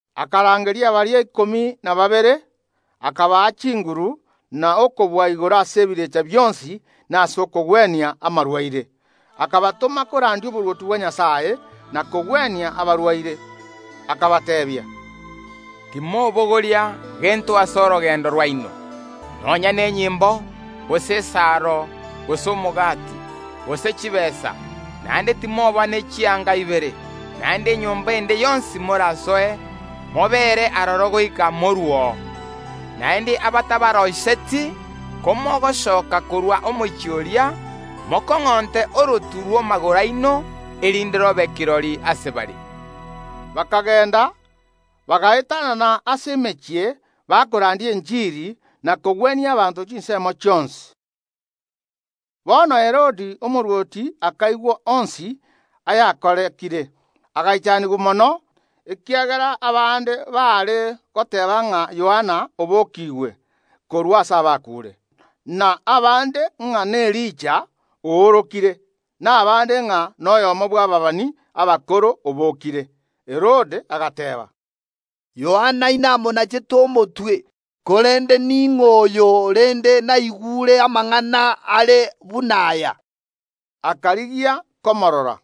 Akarangeria baria ikomi na babere akabaa chinguru na okobua igoro ase ebirecha bionsi na ase okogwenia amarwaire. Akabatoma korandia oborwoti bwa Nyasae na kogwenia abarwaire. Akabateebia, “Timobogoria gento ase orogendo rwaino, nonya nenyimbo, gose esaro, gose omogati, gose chitaabu; naende timoba ne chianga ibere. Naende enyomba ende yonsi morasoe, mobeere aroro goika moruo. Naende abatabaroiseti, komogosoka korwa omochie oria, mokong’onte orotu rw’amagoro aino, erinde robe kirori ase bare.” Bakagenda, bagaetanana ase emechie, bakorandia enchiri, na kogwenia abanto chinsemo chionsi. Bono Herode omorwoti akaigwa onsi ayakorekire, agaichanigwa mono, ekiagera abande baare goteeba ng’a Yohana obokiigwe korwa ase abakuure, na abande ng’a n’Elija oorokire, na abande ng’a noyomo bw’ababani abakoro obokire. Herode agateeba, “Yohana inamonachete omotwe, korende ning’o oyo rende naigure amang’ana are buna aya?” Akarigia komorora.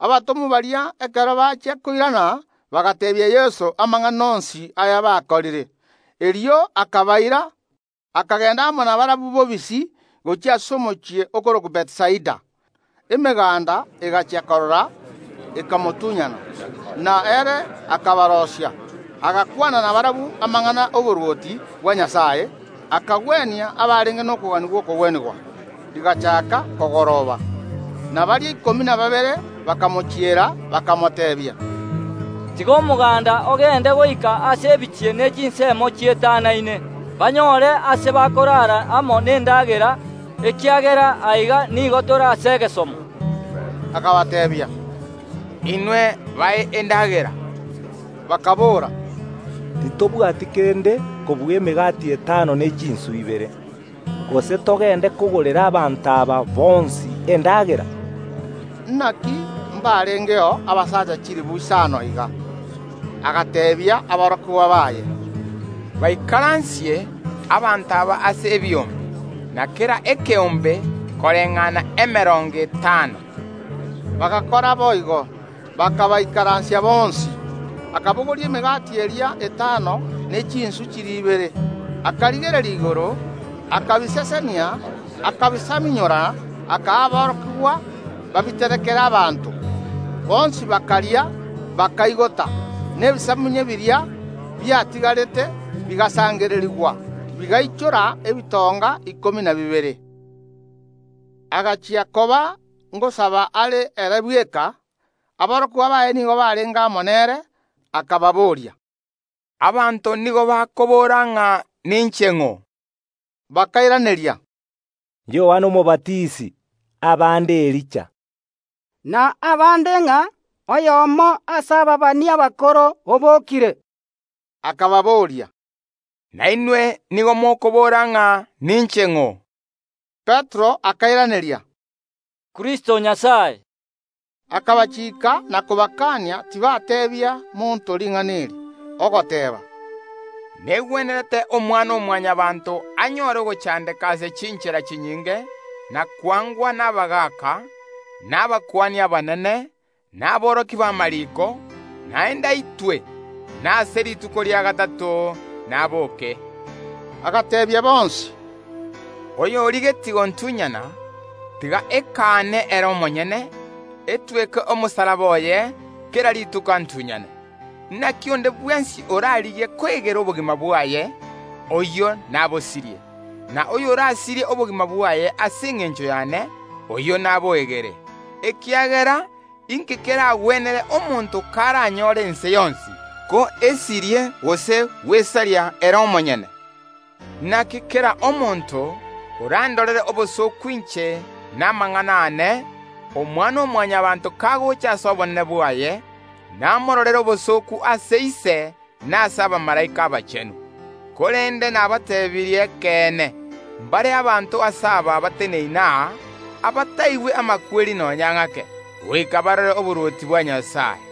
Abatomwa baria ekero bachia koirana bagateebia Yeso amang’ana onsi ayabakorire. Erio akagenda amo nabarabwo bobisi akabaira, gochia ase omochie okorokwa Bethisaida. Emeganda egachia korora, ekamotunyana, na ere akabaroisia, agakwana nabarabwo amang’ana ’oborwoti bwa Nyasae, akagwenia abarenge nokogania gw’okogwenigwa. Rigachaaka kogoroba, na baria ikomi na babere bakamochiera, bakamoteebia, “Tiga omoganda ogende goika ase ebichie ne chinsemo chietanaine, banyore aase bakorara amo nendagera, ekiagera aiga nigo tore aase erooro.” Akabateebia, “Inwe bae endagera!” Bakaboora, “Titobwati kende kobua emegati etano ne chinswe ibere. Gose togende kogorera abanto aba bonsi endagera?” Naki mbarengeo abasacha chilifu isano iga. Agateebia aborokigwa baye, “Baikaransie abanto aba ase ebiombe, na kera ekeombe koreng’ana emerongo etano.” Bagakora boigo, bakabaikaransia bonsi. Akabogoria emegati eria etano ne chinswe chiria ibere, akarigereria igoro, akabisesenia, akabisamunyora, akaa aborokigwa babiterekere abanto. Bonsi bakaria, bakaigota. Na ebisamunye biria biatigarete bigasangererigwa, bigaichora ebitonga ikomi na bibere. Engaki eyemo ekero Yeso are gosaba are ere bweka, aborokigwa baye nigo barenge ange nere, akababooria, “Abanto nigo bakobora ng’a ninche ng’o?” Bakairaneria, “Yohana Omobatisi; abande Elija, na abande ng’a oyomo ase ababani abakoro obokire.” Akababoria, “Nainwe nigo mokobora ng’a ninche ng’o?” Petero akairaneria, “Kristo o Nyasae.” Akabachiika na kobakania tibateebia monto ring’ana eri, ogoteeba, “Negwenerete Omwana‐o‐Mwanyabaanto anyore ogochandeka ase chinchera chinyinge, na kwangwa nabagaaka, na abakuani abanene, na aborokia b’amariiko, naende aitwe, na ase rituko ria gatato naboke.” Agateebia bonsi, “Oyorigetie gontunyana, tiga ekaane ere omonyene, etweke omosalaba oye kera rituko antunyane. Naki onde bwensi orarigie koegera obogima bwaye oyio nabosirie; na oyorasirie obogima bwaye ase engencho yane, oyio naboegere. Ekiagera inki eragwenere omonto karanyore ense yonsi, ko esirie gose gwesaria ere omonyene? Naki kera omonto orandorere obosooku inche na amang’ana aane, Omwana‐o‐Mwanyabaanto kagocha ase obonene bwaye, namororere obosooku ase Ise na ase abamalaika abachenu. Korende nabateebirie ekeene, mbare abanto ase aba bateneine aa, abataigwe amakweri nonya ng’ake, goika barore oborwoti bwa Nyasae.”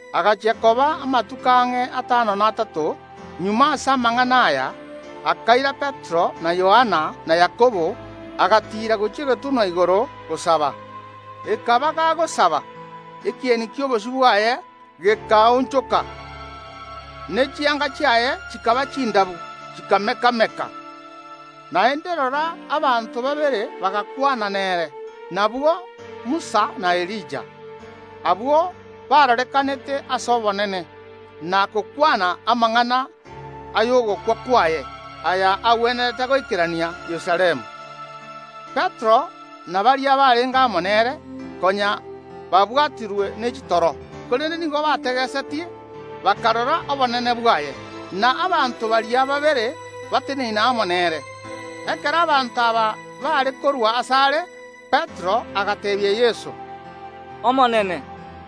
Agachia koba amatuko ang’e atano na atato magega ase amang’ana aya, akaira Petero, na Yohana, na Yakobo, agatiira gochia egetunwa igoro gosaba. Na ekero arenge gosaba, ekieni ki’obosio bwaye gekaonchoka, ne chianga chiaye chikaba chindabu, chikameka‐meka. Na agwo, abanto babere bakarorekana bagakwana nere, nabwo Musa na Elija. Abwo barorekanete ase obonene, na gokwana amang’ana ay’ogokwa kwaye, aya agwenerete goikerania Yerusalemu. Petero na baria barenge amo nere, konya babwatirwe ne chitoro, korende nigo bategesetie, bakarora obonene bwaye, na abanto baria babere bateneine amo nere. Ekero abanto aba baare korua asare, Petero agateebia Yeso, “Omonene,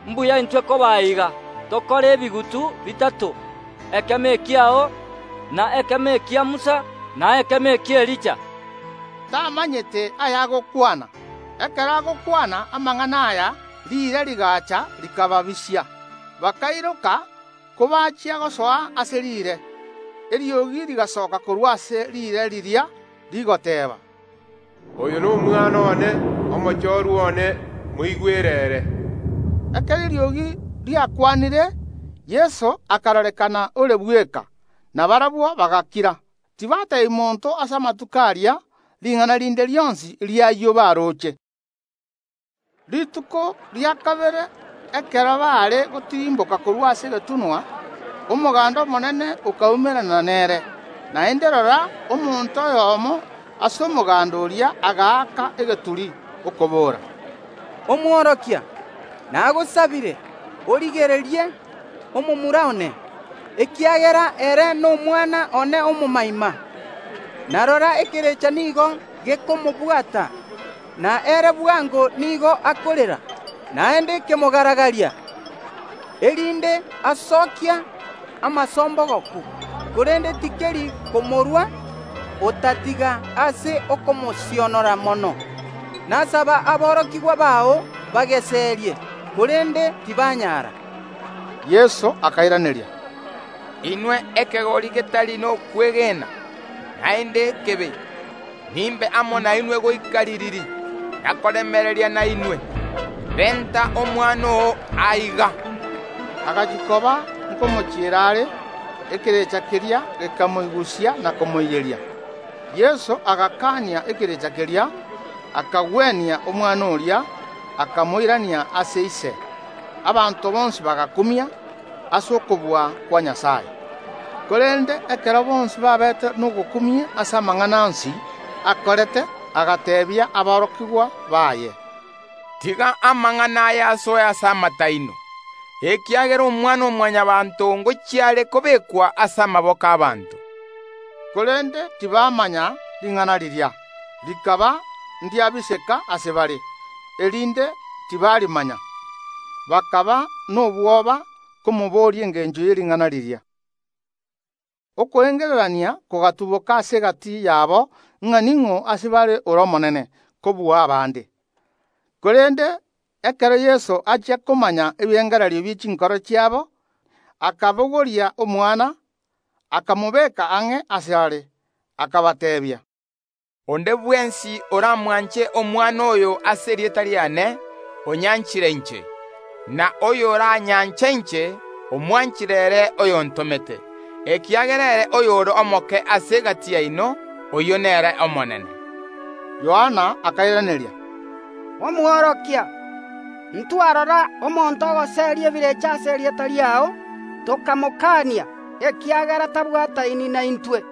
imbuya intwe koba aiga; tokore ebigutu bitato, ekemo ekiao, na ekemo ekia Musa, na ekemo eki’Elija”; tamanyete aya agokwana. Ekero agokwana amang’ana aya riire rigacha rikababisia, bakairoka kobachia gosoa ase riire. Eriogi rigasoka korwa ase riire riria rigoteeba, “Oyo n’Omwana one, Omochorwa one; moigwere ere!” Ekero eriogi riakwanire, Yeso akarorekana ore bweka. Na barabwo bagakira, tibateebia monto ase amatuko aria ring’ana rinde rionsi ri’ayio baroche. Rituko ria kabere ekero baare gotirimboka korwa ase egetunwa, omoganda omonene okaumerana nere. Naende rora, omonto oyomo ase omoganda oria agaaka egeturi, okobora, “Omworokia, nagosabire, origererie omomura one, ekiagera ere nomwana one omomoima. Na rora ekerecha nigo gekomobwata, na ere bwango nigo akorera, naende kemogaragaria, erinde asokia amasombogoku, korende tikeri komorua otatiga ase okomosionora mono. Nasaba aborokigwa bao bageserie, korende tibanyara.” Yeso akairaneria, “Inwe ekegori getari nokwegena, naende ekebe, nimbe amo nainwe goika ririri, na koremereria nainwe? Renta omomura oo aiga.” Agachia koba nkomochiera are ekerecha keria gekamoigusia na komoiyeria. Yeso agakania ekerecha keria, akagwenia omomura oria, akamoirania ase ise. Abanto bonsi bagakumia ase okobua kwa Nyasae. Korende ekero bonsi babete nogokumia ase amang’ana onsi akorete, agateebia aborokigwa baye, “Tiga amang’ana aya asoe ase amato aino, ekiagera Omwana‐o‐Mwanyabaanto ngochia are kobekwa ase amaboko ’abaanto.” Korende tibamanya ring’ana riria, rikaba ndiabiseka ase bare, erinde tibarimanya. Bakaba nobwoba komoboria engencho ye ring’ana riria. Okoengererania kogatuboka ase egati yabo ng’a ning’o ase bare ore omonene kobua abande. Korende ekero Yeso achia komanya ebirengererio bie chinkoro chiabo, akabogoria omwana, akamobeka ang’e asare, akabateebia, “Onde bwensi oramwanche omwana oyo ase erieta riane, onyanchire inche; na oyoranyanche inche, omwanchire ere oyontomete. Ekiagera ere oyore omoke ase egati yaino, oyio nere omonene.” Yohana akairaneria, “Omworokia, ntwarora omonto ogoseria ebirecha ase erieta riao, tokamokania, ekiagera tabwataini naintwe.”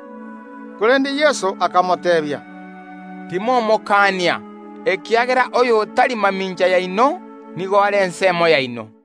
Korende Yeso akamoteebia, “Timomokania, ekiagera oyo otari mamincha yaino nigo are ensemo yaino.”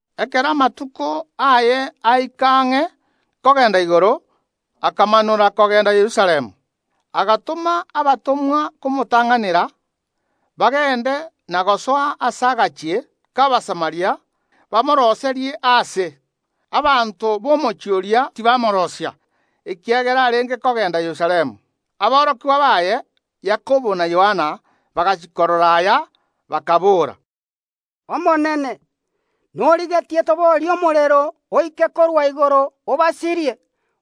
Ekero amatuko aye aika ang’e kogenda igoro, akamanora kogenda Yerusalemu. Agatoma abatomwa komotang’anera, bagende na gosoa ase agachie k’Abasamaria, bamoroiserie aase. Abanto b’omochie oria tibamoroisia, ekiagera arenge kogenda Yerusalemu. Aborokigwa baye Yakobo na Yohana bagachia korora, aya, bakaboora, “Omonene, norigetie toborie omorero oike korwa igoro obasirie?”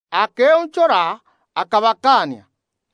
Akeonchora, akabakania.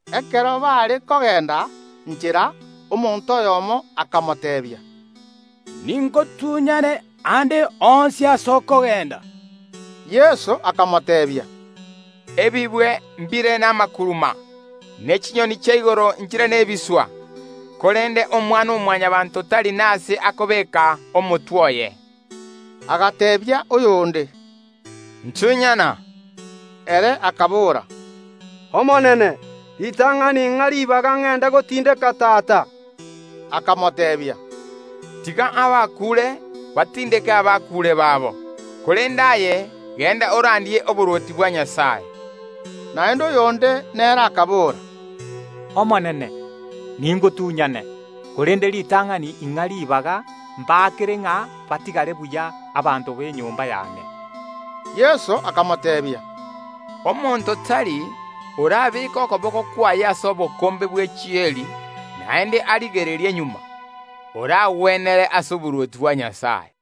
Ekero baare kogenda nchera omonto oyomo akamoteebia, “Ningotunyane aande onsi ase okogenda.” Yeso akamoteebia, “Ebibwe mbire namakuruma, ne chinyoni chia igoro nchire nebiswa, korende Omwana‐o‐Mwanyabaanto tari nase akobeeka omotwe oye.” Agateebia oyonde, “Ntunyana!” Ere akabora, “Omonene, ritang’ani ing’a ribaga ngende gotindeka tata”. Akamoteebia, “Tiga abakuure batindeke abakuure babo, korende aye genda orandie oborwoti bwa Nyasae.” Naende oyonde nere akabora, “Omonene, ningotunyane, korende ritang’ani ing’a ribaga mbaakere ng’a batigare buya abanto b’enyomba yane.” Yeso akamoteebia, “Omonto tari orabeeke okoboko kwaye ase obokombe bwe chieri, naende arigererie magega, oragwenere ase oborwoti bwa Nyasae.”